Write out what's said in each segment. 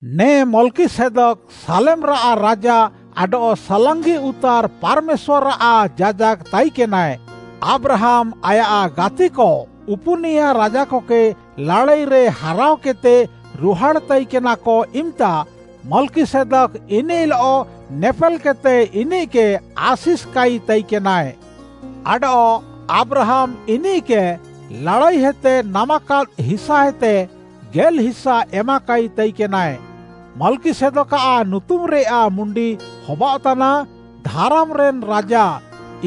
ନେ ମଲ୍‌କିସେଦକ୍‌ ସାଲେମ୍‌ରାଃ ରାଜା ଆଡଃ ସାଲାଙ୍ଗି ଉତାର୍‌ ପାର୍‌ମେଶ୍ୱାର୍‌ଆଃ ଯାଜାକ୍‌ ତାଇକେନାଏ। ଆବ୍ରାହାମ୍‌ ଆୟାଃ ଗାତିକ ଉପୁନିୟା ରାଜାକକେ ଲାଡ଼ାଇରେ ହାରାଅକେଦ୍‌ତେ ରୁହାଡ଼୍‌ ତାଇକେନାକ ଇମ୍‌ତା, ମଲ୍‌କିସେଦକ୍‌ ଇନିଃଲଃ ନେପେଲ୍‌କେଦ୍‌ତେ ଇନିଃକେ ଆଶିଷ୍‌କାଇ ତାଇକେନାଏ। ଆଡଃ ଆବ୍ରାହାମ୍‌ ଇନିଃକେ ଲାଡ଼ାଇହେତେ ନାମାକାଦ୍‌ ହିସାଏତେ ଗେଲ୍‌ହିସା ଏମାକାଇ ତାଇକେନାଏ। ମଲ୍‌କିସେଦକ୍‌ଆଃ ନୁତୁମ୍‌ରେୟାଃ ମୁଣ୍ଡି ହବାଅଃତାନା “ଧାରାମ୍‌ରେନ୍‌ ରାଜା,”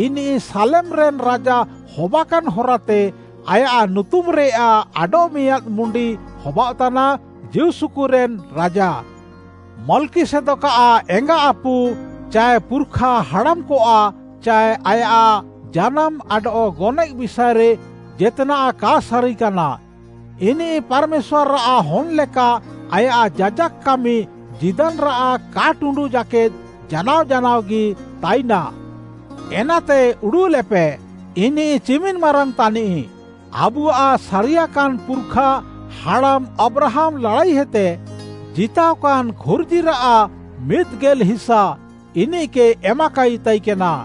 ଇନିଃ ସାଲେମ୍‌ରେନ୍‌ ରାଜା ହବାକାନ୍‌ ହରାତେ ଆୟାଃ ନୁତୁମ୍‌ରେୟାଃ ଆଡଃମିଆଁଦ୍‌ ମୁଣ୍ଡି ହବାଅଃତାନା “ଜୀଉସୁକୁରେନ୍‌ ରାଜା”। ମଲ୍‌କିସେଦକ୍‌ଆଃ ଏଙ୍ଗାଆପୁ ଚାଏ ପୁର୍‌ଖା ହାଡ଼ାମ୍‌କଆଃ ଚାଏ ଆୟାଃ ଜାନାମ୍‌ ଆଡଃ ଗନଏଃ ବିଷାଏରେ ଜେତ୍‌ନାଃ କା ସାରିକାନା। ଇନିଃ ପାର୍‌ମେଶ୍ୱାର୍‌ଆଃ ହନ୍‌ ଲେକା, ଆୟାଃ ଯାଜାକ୍‌ କାମି ଜୀଦାନ୍‌ରାଃ କା ଟୁଣ୍ଡୁଃ ଜାକେଦ୍‌ ଜାନାଅ ଜାନାଅଗି ତାଇନା। ଏନାତେ ଉଡ଼ୁଃଲେପେ, ଇନିଃ ଚିମିନ୍‌ ମାରାଙ୍ଗ୍‌ ତାନିଃ। ଆବୁଆଃ ସାରିୟାକାନ୍‌ ପୁର୍‌ଖା ହାଡ଼ାମ୍‌ ଆବ୍ରାହାମ୍‌ ଲାଡ଼ାଇହେତେ ଜିତାଅକାନ୍‌ ଖୁର୍ଜିରାଃ ମିଦ୍‌ ଗେଲ୍‌ହିସା ଇନିଃକେ ଏମାକାଇ ତାଇକେନା।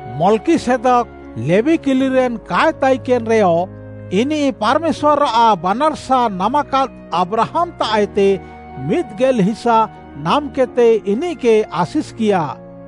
ମଲ୍‌କିସେଦକ୍‌ ଲେବୀ କିଲିରେନ୍‌ କାଏ ତାଇକେନ୍‌ରେୟ, ଇନିଃ ପାର୍‌ମେଶ୍ୱାର୍‌ଆଃ ବାନାର୍‌ସା ନାମାକାଦ୍‌ ଆବ୍ରାହାମ୍‌ତାଃଏତେ ମିଦ୍‌ ଗେଲ୍‌ହିସା ନାମ୍‌କେଦ୍‌ତେ ଇନିଃକେ ଆଶିଷ୍‌କିୟା।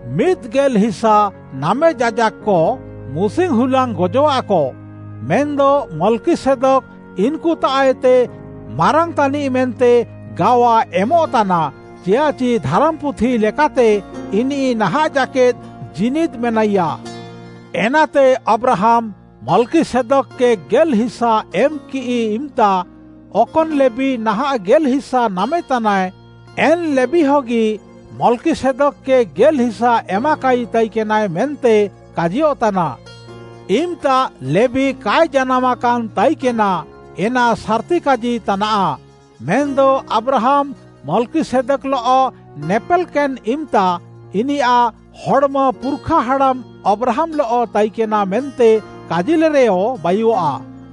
ମିଦ୍‌ ଗେଲ୍‌ହିସା ନାମେ ଯାଜାକ୍‌କ, ମୁସିଙ୍ଗ୍‌ ହୁଲାଙ୍ଗ୍‌ ଗଜଃଆକ, ମେନ୍‌ଦ ମଲ୍‌କିସେଦକ୍‌ ଇନ୍‌କୁତାଃଏତେ ମାରାଙ୍ଗ୍‌ ତାନିଃ ମେନ୍ତେ ଗାୱା ଏମଃତାନା, ଚିଆଃଚି ଧାରାମ୍‌ପୁଥି ଲେକାତେ ଇନିଃ ନାହାଁଃ ଜାକେଦ୍‌ ଜୀନିଦ୍‌ ମେନାଇୟା। ଏନାତେ ଆବ୍ରାହାମ୍‌ ମଲ୍‌କିସେଦକ୍‌କେ ଗେଲ୍‌ହିସା ଏମ୍‌କିଃ ଇମ୍‌ତା, ଅକନ୍‌ ଲେବୀ ନାହାଁଃ ଗେଲ୍‌ହିସା ନାମେତାନାଏ, ଏନ୍‌ ଲେବୀହଗି ମଲ୍‌କିସେଦକ୍‌କେ ଗେଲ୍‌ହିସା ଏମାକାଇ ତାଇକେନାଏ ମେନ୍ତେ କାଜିୟଃତାନା। ଇମ୍‌ତା ଲେବୀ କାଏ ଜାନାମ୍‌କାନ୍‌ ତାଇକେନା ଏନା ସାର୍‌ତିକାଜି ତାନାଃ, ମେନ୍‌ଦ ଆବ୍ରାହାମ୍‌ ମଲ୍‌କିସେଦକ୍‌ଲଃ ନେପେଲ୍‌କେନ୍‌ ଇମ୍‌ତା, ଇନିୟାଃ ହଡ଼୍‌ମ ପୁର୍‌ଖା ହାଡ଼ାମ୍‌ ଆବ୍ରାହାମ୍‌ଲଃ ତାଇକେନା ମେନ୍ତେ କାଜିଲେରେୟ ବାୟୁଃଆ।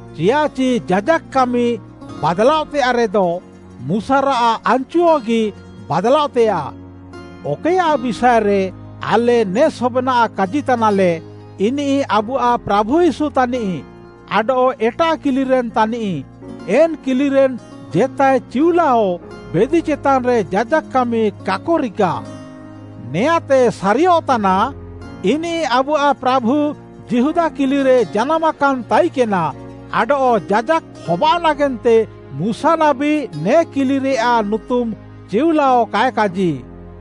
ଚିୟାଃଚି ଯାଜାକ୍‌ କାମି ବାଦ୍‌ଲାଅଃତେୟାଃରେଦ, ମୁଶାରାଃ ଆନ୍‌ଚୁହଗି ବାଦ୍‌ଲାଅଃତେୟାଃ। ଅକଏୟାଃ ବିଷାଏରେ ଆଲେ ନେ ସବେନାଃ କାଜିତାନାଲେ, ଇନିଃ ଆବୁଆଃ ପ୍ରାଭୁ ୟୀଶୁ ତାନିଃ ଆଡଃ ଏଟାଃ କିଲିରେନ୍‌ ତାନିଃ। ଏନ୍‌ କିଲିରେନ୍‌ ଜେତାଏ ଚିଉଲାଅ ବେଦି ଚେତାନ୍‌ରେ ଯାଜାକ୍‌ କାମି କାକ ରିକା। ନେଆଁଁତେ ସାରିୟଃତାନା, ଇନିଃ ଆବୁଆଃ ପ୍ରାଭୁ ଯିହୁଦା କିଲିରେ ଜାନାମ୍‌କାନ୍‌ ତାଇକେନା ଆଡଃ ଯାଜାକ୍‌ ହବାଅଃ ନାଗେନ୍ତେ ମୁଶା ନାବୀ ନେ କିଲିରେୟାଃ ନୁତୁମ୍‌ ଚିଉଲାଅ କାଏ କାଜି।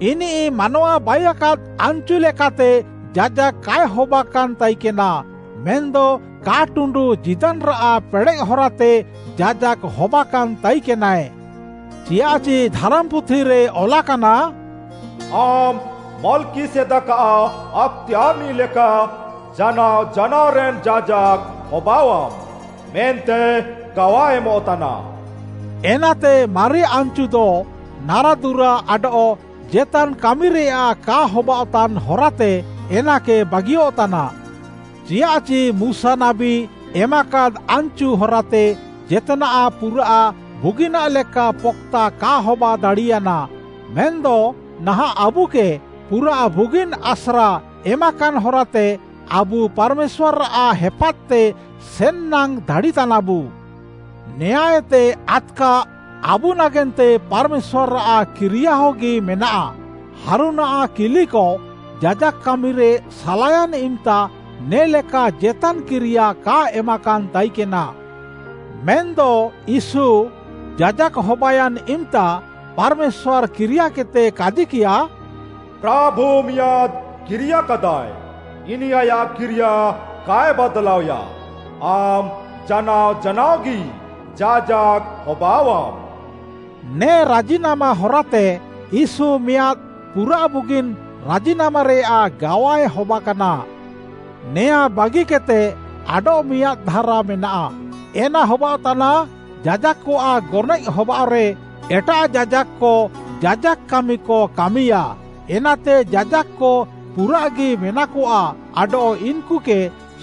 ଇନିଃ ମାନୱା ବାଇୟାକାଦ୍‌ ଆନ୍‌ଚୁ ଲେକାତେ ଯାଜାକ୍‌ କାଏ ହବାକାନ୍‌ ତାଇକେନା, ମେନ୍‌ଦ କା ଟୁଣ୍ଡୁଃ ଜୀଦାନ୍‌ରାଃ ପେଡ଼େଃ ହରାତେ ଯାଜାକ୍‌ ହବାକାନ୍‌ ତାଇକେନାଏ। ଚିୟାଃଚି ଧାରାମ୍‌ପୁଥିରେ ଅଲାକାନା, “ଆମ୍‌ ମଲ୍‌କିସେଦକ୍‌ଆଃ ଆକ୍‌ତେୟାର୍‌ନିଃ ଲେକା ଜାନାଅ ଜାନାଅରେନ୍‌ ଯାଜାକ୍‌ ହବାଅଃଆମ୍‌, ମେନ୍ତେ ଗାୱା ଏମଃତାନା।” ଏନାତେ ମାରି ଆନ୍‌ଚୁଦ ନାରାଦୁରା ଆଡଃ ଜେତାନ୍‌ କାମିରେୟାଃ କା ହବାଅଃତାନ୍‌ ହରାତେ ଏନାକେ ବାଗିୟଃତାନା। ଚିୟାଃଚି ମୁଶା ନାବୀ ଏମାକାଦ୍‌ ଆନ୍‌ଚୁ ହରାତେ ଜେତ୍‌ନାଃ ପୁରାଃ ବୁଗିନାଃ ଲେକା ପକ୍‌ତା କା ହବାଦାଡ଼ିୟାନା, ମେନ୍‌ଦ ନାହାଁଃ ଆବୁକେ ପୁରାଃ ବୁଗିନ୍‌ ଆସ୍ରା ଏମାକାନ୍‌ ହରାତେ, ଆବୁ ପାର୍‌ମେଶ୍ୱାର୍‌ଆଃ ହେପାଦ୍‌ତେ ସେନ୍‌ନାଙ୍ଗ୍‌ ଦାଡ଼ିତାନାବୁ। ନେଆଁଁଏତେ ଆଦ୍‌କା, ଆବୁ ନାଗେନ୍ତେ ପାର୍‌ମେଶ୍ୱାର୍‌ଆଃ କିରିୟାହଗି ମେନାଃ। ହାରୁନ୍‌ଆଃ କିଲିକ ଯାଜାକ୍‌ କାମିରେ ସାଲାୟାନ୍‌ ଇମ୍‌ତା ନେ'ଲେକା ଜେତାନ୍‌ କିରିୟା କା ଏମାକାନ୍‌ ତାଇକେନା। ମେନ୍‌ଦ ୟୀଶୁ ଯାଜାକ୍‌ ହବାୟାନ୍‌ ଇମ୍‌ତା ପାର୍‌ମେଶ୍ୱାର୍‌ କିରିୟାକେଦ୍‌ତେ କାଜିକିୟା, “ପ୍ରାଭୁ ମିଆଁଦ୍‌ କିରିୟାକାଦାଏ, ଇନିଃ ଆୟାଃ କିରିୟା କାଏ ବାଦ୍‌ଲାଅଏୟା, ଆମ୍‌ ଜାନାଅ ଜାନାଅଗି ଯାଜାକ୍‌ ହବାଅଃଆମ୍‌।” ନେ ରାଜିନାମା ହରାତେ ୟୀଶୁ ମିଆଁଦ୍‌ ପୁରାଃ ବୁଗିନ୍‌ ରାଜିନାମାରେୟାଃ ଗାୱାଏ ହବାକାନା। ନେଆଁଁ ବାଗିକେଦ୍‌ତେ ଆଡଃମିଆଁଦ୍‌ ଧାରା ମେନାଃ, ଏନା ହବାଅଃତାନା, ଯାଜାକ୍‌କଆଃ ଗନଏଃ ହବାଅଃରେ, ଏଟାଃ ଯାଜାକ୍‌କ ଯାଜାକ୍‌ କାମିକ କାମିୟାଃ, ଏନାତେ ଯାଜାକ୍‌କ ପୁରାଃଗି ମେନାକଆ ଆଡଃ ଇନ୍‌କୁକେ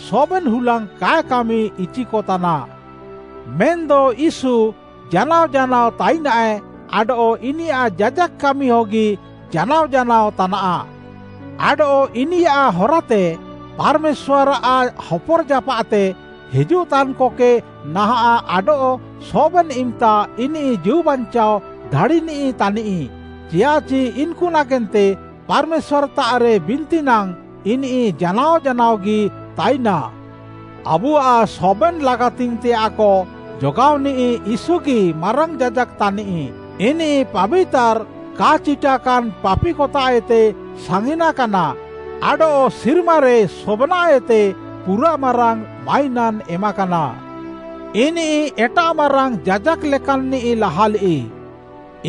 ସବେନ୍‌ ହୁଲାଙ୍ଗ୍‌ କାଏ କାମିଇଚିକତାନା। ମେନ୍‌ଦ ୟୀଶୁ ଜାନାଅ ଜାନାଅ ତାଇନାଏ ଆଡଃ ଇନିୟାଃ ଯାଜାକ୍‌ କାମି ହଗି ଜାନାଅ ଜାନାଅ ତାନାଃ। ଆଡଃ ଇନିୟାଃ ହରାତେ ପାର୍‌ମେଶ୍ୱାର୍‌ଆଃ ହପର୍‌ଜାପାଃତେ ହିଜୁଃତାନ୍‌କକେ ନାହାଁଃ ଆଡଃ ସବେନ୍‌ ଇମ୍‌ତା ଇନିଃ ଜୀଉବାଞ୍ଚାଅ ଦାଡ଼ିନିଃ ତାନିଃ, ଚିୟାଃଚି ଇନ୍‌କୁ ନାଗେନ୍ତେ ପାର୍‌ମେଶ୍ୱାର୍‌ତାଃରେ ବିନ୍ତି ନାଙ୍ଗ୍‌ ଇନିଃ ଜାନାଅ ଜାନାଅଗି ତାଇନା। ଆବୁଆଃ ସବେନ୍‌ ଲାଗାତିଙ୍ଗ୍‌ତେୟାଃକ ଯୋଗାଅନିଃ ୟୀଶୁଗି ମାରାଙ୍ଗ୍‌ ଯାଜାକ୍‌ ତାନିଃ। ଇନିଃ ପାବିତାର୍‌, କା ଚିଟାକାନ୍‌, ପାପିକତାଃଏତେ ସାଙ୍ଗିନାକାନା, ଆଡଃ ସିର୍ମାରେ ସବେନାଃଏତେ ପୁରାଃ ମାରାଙ୍ଗ୍‌ ମାଇନାନ୍‌ ଏମାକାନା। ଇନିଃ ଏଟାଃ ମାରାଙ୍ଗ୍‌ ଯାଜାକ୍‌ ଲେକାନ୍‌ନିଃ ନାହାଁଲିଃ,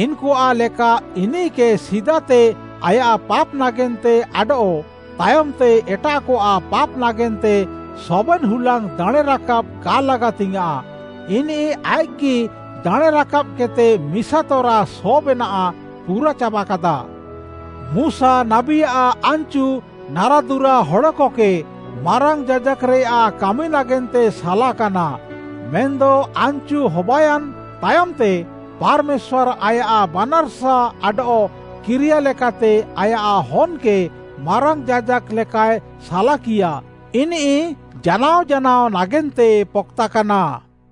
ଇନ୍‌କୁଆଃ ଲେକା ଇନିଃକେ ସିଦାତେ ଆୟାଃ ପାପ୍‌ ନାଗେନ୍ତେ ଆଡଃ ତାୟମ୍‌ତେ ଏଟାଃକଆଃ ପାପ୍‌ ନାଗେନ୍ତେ ସବେନ୍‌ ହୁଲାଙ୍ଗ୍‌ ଦାଣେଁରାକାବ୍‌ କା ଲାଗାତିଙ୍ଗ୍‌ୟାଁଃ। ଇନିଃ ଆଇଃକ୍‌କେଗି ଦାଣେଁ ରାକାବ୍‌କେଦ୍‌ତେ ମିସାତରା ସବେନାଃ ପୁରାଚାବାକାଦା। ମୁଶା ନାବୀଆଃ ଆନ୍‌ଚୁ ନାରାଦୁରା ହଡ଼କକେ ମାରାଙ୍ଗ୍‌ ଯାଜାକ୍‌ରେୟାଃ କାମି ନାଗେନ୍ତେ ସାଲାକାନା। ମେନ୍‌ଦ ଆନ୍‌ଚୁ ହବାୟାନ୍‌ ତାୟମ୍‌ତେ ପାର୍‌ମେଶ୍ୱାର୍‌ ଆୟାଃ ବାନାର୍‌ସା ଆଡଃ କିରିୟା ଲେକାତେ ଆୟାଃ ହନ୍‌କେ ମାରାଙ୍ଗ୍‌ ଯାଜାକ୍‌ ଲେକାଏ ସାଲାକିୟା, ଇନିଃ ଜାନାଅ ଜାନାଅ ନାଗେନ୍ତେ ପକ୍‌ତାକାନା।